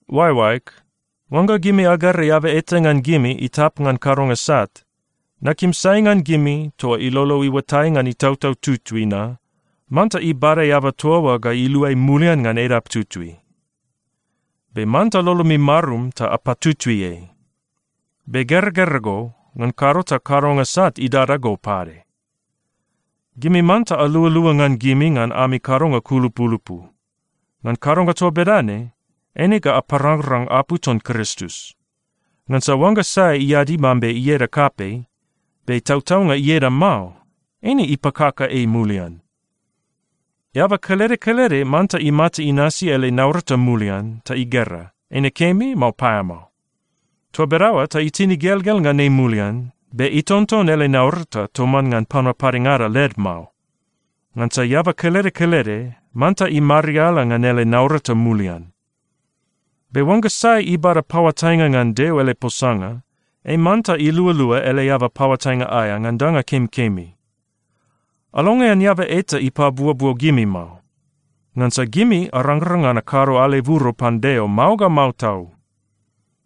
Oaeoaeg, oangga gimi agera eaba eta ngan gimi itap ngan kadonga sat, nakim sai ngan gimi toa ilolo iuatai ngan Itautau Tutui na manta ibada eaba toa oa ga iluai mulian ngan edap tutui. Be manta lolomi marum ta apatutui ei. Be geragera go, ngan kado ta kadonga sat idada go pade. Gimi manta alualua ngan gimi ngan ami kadonga kulupulupu. Ngan kadonga toa bedane, eine ga aparangrang apu ton Kristus. Ngansa oangga sai iadi mambe ieda kapei, be tautaunga ieda mao, eine ipakaka ei mulian. Eaba kelede kelede manta imata inasi ele naurata mulian ta igera, eine kemi, mao paeamao. Toa bedaoa ta itin igelgel ngan ei mulian, be itonton ele naurata toman ngan panua padengada led mao. Ngansa eaba kelede kelede manta imariala ngan ele naurata mulian. Be oangga sai ibada paoatainga ngan Deo ele posanga, ei manta ilualua ele eaba paoatainga aea ngan danga kemikemi. Alongean eaba eta ipabuobuo gimi mao. Ngansa gimi arangrang ngan akado aleburo pan Deo mao ga mao tau.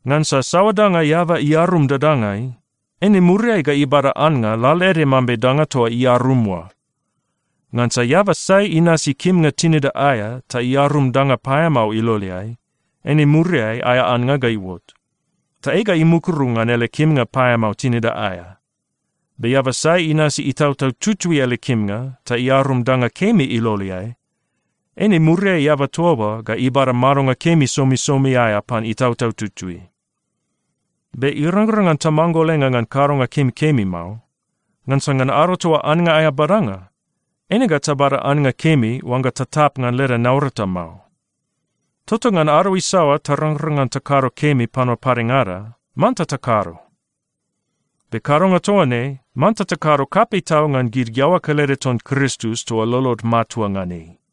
Ngansa saoa danga eaba iarum dadangai, eine muriai ga ibada annga lalaede mambe danga toa iarum oa. Ngansa eaba sai inasi kimnga tinida aea ta iarum danga paeamao iloleai, eine muriai aea annga ga iuot, ta ei ga imukuru ngan ele kimnga paeamao tinida aea. Be eaba sai inasi Itautau Tutui ele kimnga ta iarum danga kemi iloleai, eine muriai eaba toa oa ga ibada madonga kemi somisomi aea pan Itautau Tutui. Be irangrang ngan tamanggolenga ngan kadonga kemikemi mao. Ngansa ngan ado toa annga aea badanga, eine ga tabada annga kemi oangga tatap ngan leda naurata mao. Tota ngan ado isaoa tarangrang ngan takado kemi panua padengada, manta takado. Be kadonga toa ne, manta takado kapei tau ngan gid iaoa kelede ton Kristus toa lolod matua ngan ei.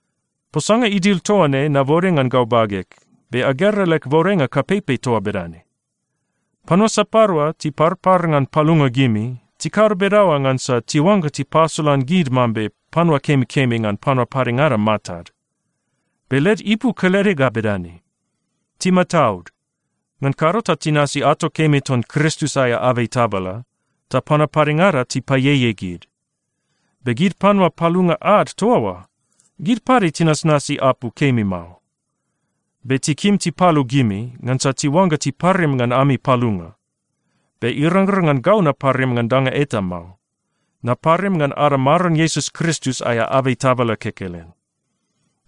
Posanga idil toa ne nabode ngan gau bageg, be agera leg bodenga kapeipei toa bedane. Panua sapadua tiparpar ngan palunga gimi, tikado bedaoa ngansa tiuangga tipasolan gid mambe panua kemikemi ngan panua padengada matad. Be led ipu kelede ga bedane: Timataud, ngan kado ta tinasi ato kemi ngan Kristus aea abei tabala, ta panua padengada tipaieiei gid. Be gid panua palunga ad toa oa, gid pade tinasnasi apu kemi mao. Be tikim tipalu gimi, ngansa tiuangga tiparim ngan ami palunga. Be irangrang ngan gau naparim ngan danga eta mao. Naparim ngan ada Maron Iesus Kristus aea abei tabala kekelen.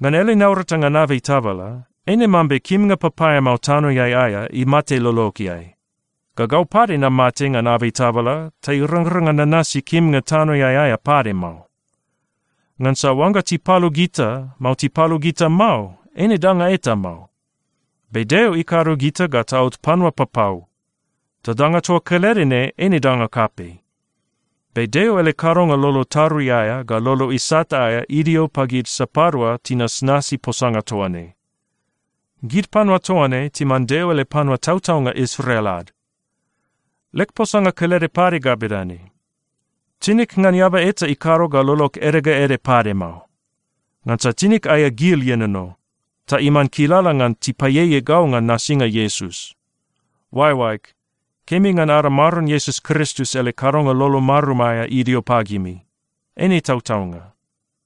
Ngan ele naurata ngan abei tabala, eine mambe kimnga papaeamao tanoeai aea imate lologeai, ga gau pade namate ngan abei tabala ta irangrang ngan nanasi kimnga tanoeai aea pade mao. Ngansa oangga tipalu gita, mao tipalu gita mao, eine danga eta mao. Be Deo ikado gita ga taot panua papau, ta danga toa kelede ne eine danga kapei. Be Deo ele kadonga lolo tarui aea ga lolo isat aea idio pagid sapadua tinasnasi posanga toa ne. Gid panua toa ne timan Deo ele panua tautaunga Israel ad. Leg posanga kelede pade ga bedane: Tinig ngan eaba eta ikado ga lolog ede ga ede pade mao. Ngansa tinig aea gil ienono, ta iman kilala ngan tipaieiei gau ngan nasinga Iesus. Oaeoaeg, kemi ngan ada Maron Iesus Kristus ele kadonga lolo marum aea idio pagimi. Eine tautaunga.